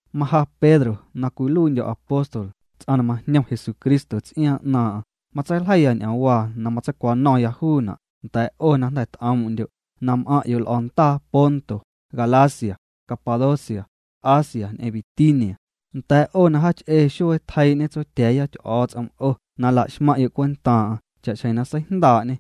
Maja Pedro na cwiluiindyo̱ apóstol, ts'aⁿ na majñom Jesucristo ts'iaaⁿ 'naaⁿ'aⁿ matseiljeiya ñ'oomwaa na matseicwano̱ⁿya juuna' nda̱a̱' 'o na jnda̱ t'oom'ndyo', na m'aⁿ'yo' l'o̱ndaa Ponto, Galacia, Capadocia, Asia ñ'eⁿ Bitinia, nda̱a̱' 'o na jaach'ee xuee tjeii'ñe Tsotya̱a̱ya Ty'o̱o̱ts'om 'o na laxmaⁿ'yo' cwentaaⁿ'aⁿ cha'xjeⁿ na seijndaa'ñê.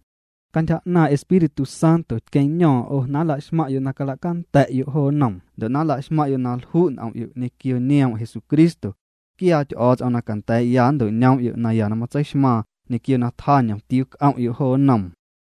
Cantyja 'naaⁿ' Espíritu Santo tqueⁿño̱o̱ⁿ 'o na nlaxmaⁿ'yo' na calacanda̱'yo' jo noom ndo' na nlaxmaⁿ'yo' na lju' n'om'yo' ñequio nioom' Jesucristo. Quiaa Ty'o̱o̱ts'om na canda̱a̱'ya nnto'ñoom'yo' naya na matseixmaaⁿ ñequio na tjaa ñomtiuu c'om'yo' jo nnoom.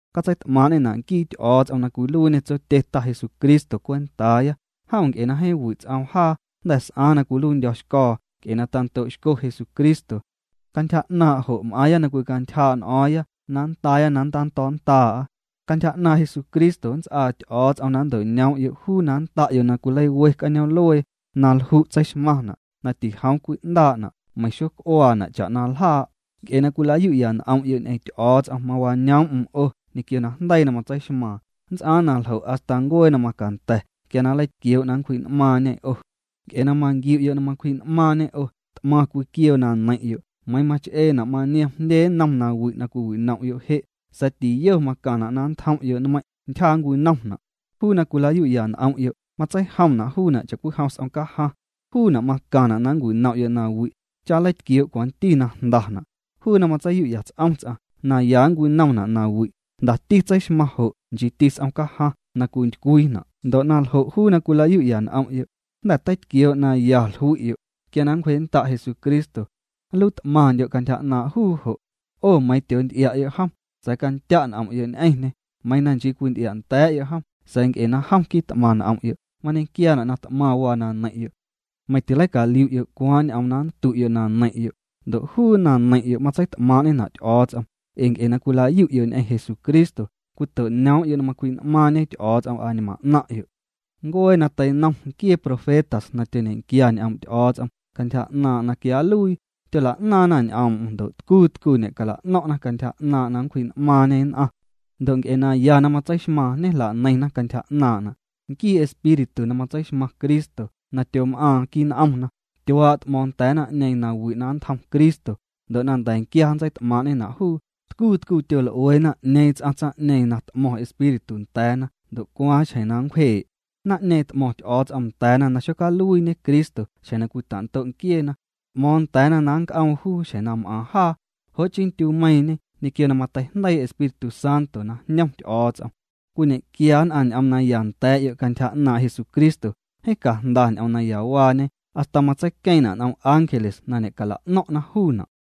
Catseit'maaⁿ'ñena' nquii Ty'o̱o̱ts'om na cwiluiiñê Tsotye Ta Jesucristo cwentaaya. Jom nc'e na jeeⁿ wi' ts'oom jaa jnda̱ s'aaⁿ na cwiluiindyo̱xco̱o̱ nc'e na tando'xco Jesucristo. Cantyja 'naaⁿ' jo' m'aaⁿya na cwicantyjaa' n'o̱o̱ⁿya na nndaaya na nntando̱o̱'a. Cantyja 'naaⁿ' Jesucristo nnts'aa Ty'o̱o̱ts'om na nnto'ñoom'yo' juu na nnda'yo' na cwileiwe cañoom'luee na lju' tseixmaⁿna' na tijoom cwi'ndaa' meiⁿ xoc'uaana' cha'na ljaa'. Nc'e na cwilayu'ya n'om'yo' ñ'eⁿ Ty'o̱o̱ts'om mawañoom'm 'o ñequio najndeii na matseixmaaⁿ. Nnts'aaⁿ na ljo' hasta ncuee na macanda̱ quia na nleitquioo' na nncwji'n'maaⁿñê 'o. Nc'e na manquiu'yo' na macwji'n'maaⁿñê 'o, t'maⁿ cwiquioo na neiⁿ'yo', meiiⁿ mach'eena' maniom jndye nnom nawi' na cwiwinom'yo' je'. Sa̱a̱ tiyo macaⁿna' na nntjom'yo' nmeiⁿ', ntyja nncwinomna'. Juu na cwila'yu'ya n'om'yo' matseijomna' juuna' cha'cwijom s'om cajaⁿ, juuna' macaⁿna' na nncwinom'yo' nawi' cha nleitquioo' cwanti na jndana'. Juu na matseiyu'ya ts'om ts'aⁿ na ya nncwinomna' nawi', jndati tseixmaⁿ jo' nchiiti s'om cajaⁿ na cwintycwiina'. Ndo' naljo', juu na cwila'yu'ya n'om'yo', jnda̱ teitquioo' na ya jlui'yo', quia na nncwjee'nnda' Jesucristo, nluii't'maⁿndyo' cantyja 'naaⁿ' juu jo'. 'O meiiⁿ tyoonty'ia'yo' jom, sa̱a̱ candya' n'om'yo' ñ'eⁿñê. Meiiⁿ na nchii cwinty'ia'nda̱a̱'yo' jom, sa̱a̱ nc'e na jom quit'maⁿ n'om'yo', mañequiaana' na t'maⁿ waa na neiⁿ'yo'. Meiⁿ tileicaliu'yo' cwaaⁿ ñ'oom na nndu'yo' na neiⁿ'yo'. Ndo' juu na neiⁿ'yo' matseit'maaⁿ'ñena' Ty'o̱o̱ts'om. Ee nc'e na cwila'yu'yo' ñ'eⁿ Jesucristo, cwito'ñoom'yo' na macwji'n'maaⁿñe Ty'o̱o̱ts'om añmaⁿ 'naⁿ'yo'. Ncuee na teinom nquiee profetas na tyoñequia ñ'oom' Ty'o̱o̱ts'om cantyja 'naaⁿ' na quia nluii, tyola'naaⁿna ñ'oom'm ndo' tcuu tcuu ñe'cala'no̱ⁿ'na cantyja 'naaⁿ' na nncwji'n'maaⁿñê nn'aⁿ, ndo' nc'e naya na matseixmaaⁿ ñejlaneiⁿna cantyja 'naaⁿ'na'. Nquii Espíritu na matseixmaⁿ Cristo na tyom'aaⁿ quii' n'omna, tyuaa' t'mo̱o̱ⁿ nda̱a̱ naⁿ'ñeeⁿ nawi' na ntjom Cristo ndo' na nda̱quia nntseit'maaⁿ'ñena' juu. Tcuu tcuu tyol'ueena 'ñeeⁿ ts'aⁿ tsaⁿ'ñeeⁿ na t'mo̱ⁿ Espíritu nda̱a̱na ndo' cwaaⁿ xjeⁿ nncwjee'. Naⁿ'ñeeⁿ t'mo̱ⁿ Ty'o̱o̱ts'om nda̱a̱na na tixocaluiiñe Cristo xjeⁿ na cwita'ndo' nquieena. T'mo̱o̱ⁿ nda̱a̱na na nnc'oom juu xjeⁿ na m'aaⁿ jaa. Jo' chii ndyumeiiⁿñe, ñequio na mateijndeii Espíritu Santo na jñom Ty'o̱o̱ts'om, cwiñe'quia nn'aⁿ ñ'oom naya nda̱a̱'yo' cantyja 'naaⁿ' Jesucristo. Jeeⁿ cajnda ñ'oom nayawaañe hasta matseiqueeⁿna' n'om ángeles na ñecala'no̱ⁿ'na juuna'.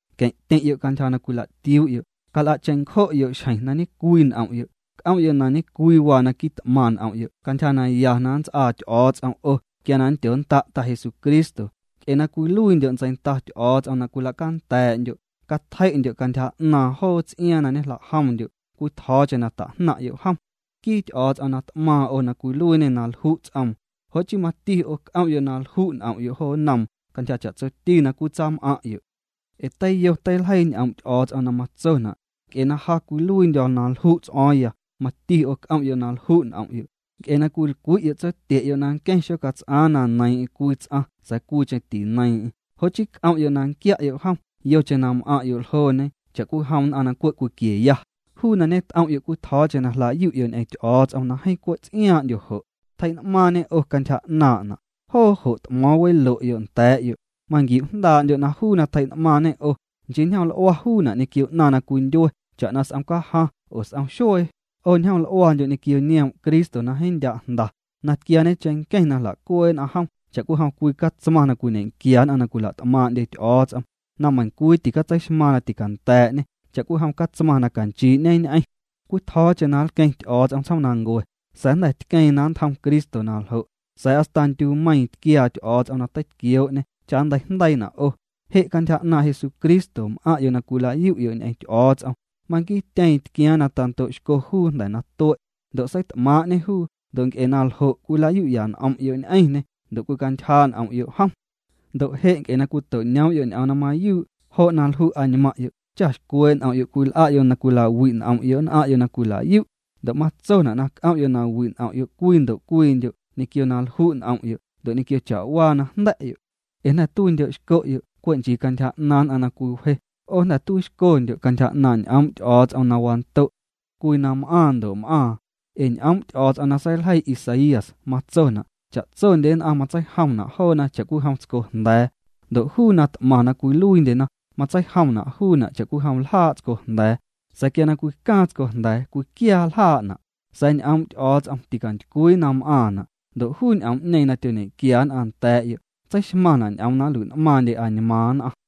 Queⁿ'tyeⁿ'yo' cantyja na cwila'tiuu'yo'. Cal'a' cheⁿncjo'yo' xjeⁿ na ñe'cwii n'om'yo'. C'om'yo' na ñe'cwii waa na quit'maⁿ n'om'yo' cantyja naya na nnts'aa Ty'o̱o̱ts'om 'o quia na nndyonnda' Ta Jesucristo. Nc'e na cwiluiindyo' ntseinda Ty'o̱o̱ts'om na cwila'canda̱a̱'ndyo', catjei'ndyo' cantyja 'naaⁿ joo ts'iaaⁿ na ñejla'jomndyo' cwitjo̱o̱cheⁿ na ta'jnaⁿ'yo' jom. Nquii Ty'o̱o̱ts'om na t'maaⁿ 'o cwiluiiñê na lju' ts'oom. Jo' chii mati 'o c'om'yo' na lju' n'om'yo' jo nnoom cantyja cha'tsoti na cwitsam'aⁿ'yo'. Ee teiyo teiljeii ñ'oom' Ty'o̱o̱ts'om na matsona': “Nc'e na ja cwiluiindyo̱ na lju' ts'o̱o̱ⁿya, mati 'o c'om'yo' na lju' n'om'yo'.” Nc'e na cwilcwi'yo' Tsotye'yo' na nqueⁿ xocats'aaⁿ na neiiⁿ'eⁿ cwii ts'aⁿ sa̱a̱ cwiicheⁿ tineiiⁿ'eⁿ, jo' chii c'om'yo' na nquia'yo' jom yocheⁿ na m'aⁿ'yo' ljooñe cha'cwijom nn'aⁿ na cwe' cwiqueya. Juu na ñet'om'yo' cwitjo̱o̱cheⁿ na jla'yu'yo' ñ'eⁿ Ty'o̱o̱ts'om na jeeⁿ cwe' ts'iaaⁿ'ndyo jo', tjei'ñ'maaⁿñê 'o cantyja 'naaⁿ'na', joo jo' t'mo̱o̱ⁿ welo'yo' nda̱a̱'yo'. Manquiu'jndaa'ndyo' na juu na tjei'n'maaⁿñê 'o, nchii ñjoml'ua juuna' ñequio 'naⁿ na cwindyue, cha'na s'om cajaⁿ oo s'om xuee, 'o ñjoml'uandyo' ñequio nioom' Cristo na jeeⁿ ndya' jnda, na tquiaañe cheⁿnqueⁿ na jla'cuee'na jom cha'cwijom cwii catsmaⁿ na cwiñe'quia nn'aⁿ na cwila't'maaⁿ'ndyena Ty'o̱o̱ts'om, na meiⁿcwii ticatseixmaaⁿ na ticanda̱a̱'ñê, cha'cwijom catsmaⁿ na canchii'ñeñ'eⁿ. Cwitjo̱o̱cheⁿ na nlqueⁿ Ty'o̱o̱ts'om tsjoomnancue, sa̱a̱ jnda̱ tqueeⁿ na nntjom Cristo na ljo'. Sa̱a̱ hasta ndyumeiiⁿ tquiaa Ty'o̱o̱ts'om na teitquioo'ñê cha nnteijndeiina' 'o. Je' cantyja 'naaⁿ' Jesucristo m'aⁿ'yo' na cwila'yu'yo' ñ'eⁿ Ty'o̱o̱ts'om. Manquiityeeⁿ tquiaaⁿ na tando'xco juu jnda̱ na tue', ndo' seit'maaⁿ'ñê juu. Ndo' nc'e na ljo' cwila'yu'ya n'om'yo' ñ'eⁿñê, ndo' cwicantyjaa' n'om'yo' jom. Ndo' je', nc'e na cwito'ñoom'yo' ñ'oom na mayuu', jo' na lju' añmaaⁿ'yo' cha xcwee' n'om'yo' cwil'a'yo' na cwilawi' n'om'yo' nn'aⁿ'yo' na cwila'yu'. Ndo' matsona' na c'om'yo' na wi' n'om'yo' cwii ndo' cwiindyo' ñequio na lju' n'om'yo' ndo' ñequio cha'waa na jnda̱'yo'. Ee jnda̱ tuiixcondyo' cwe' nchii cantyja 'naaⁿ nn'aⁿ na cwiwje. 'O jnda̱ tuiixcondyo' cantyja 'naaⁿ' ñ'oom' Ty'o̱o̱ts'om na wando', cwii na m'aaⁿ ndo' m'aaⁿ. Ee ñ'oom' Ty'o̱o̱ts'om na seiljeii Isaías, matsona': Cha'tsondye nn'aⁿ matseijomna' joona cha'cwijom tsco jnda̱a̱. Ndo' juu na t'maⁿ na cwiluiindyena matseijomna' juuna' cha'cwijom ljaa' tsco jnda̱a̱. Sa̱a̱ quia na cwicaaⁿ tsco jnda̱a̱, cwiquiaa ljaa'na', sa̱a̱ ñ'oom' Ty'o̱o̱ts'om ticantycwii na m'aaⁿna'. Ndo' juu ñ'oom'ñeeⁿ na tyoñequia nn'aⁿ nda̱a̱'yo' tseixmaⁿna' ñ'oom na nlui'n'maaⁿndye añmaaⁿ nn'aⁿ.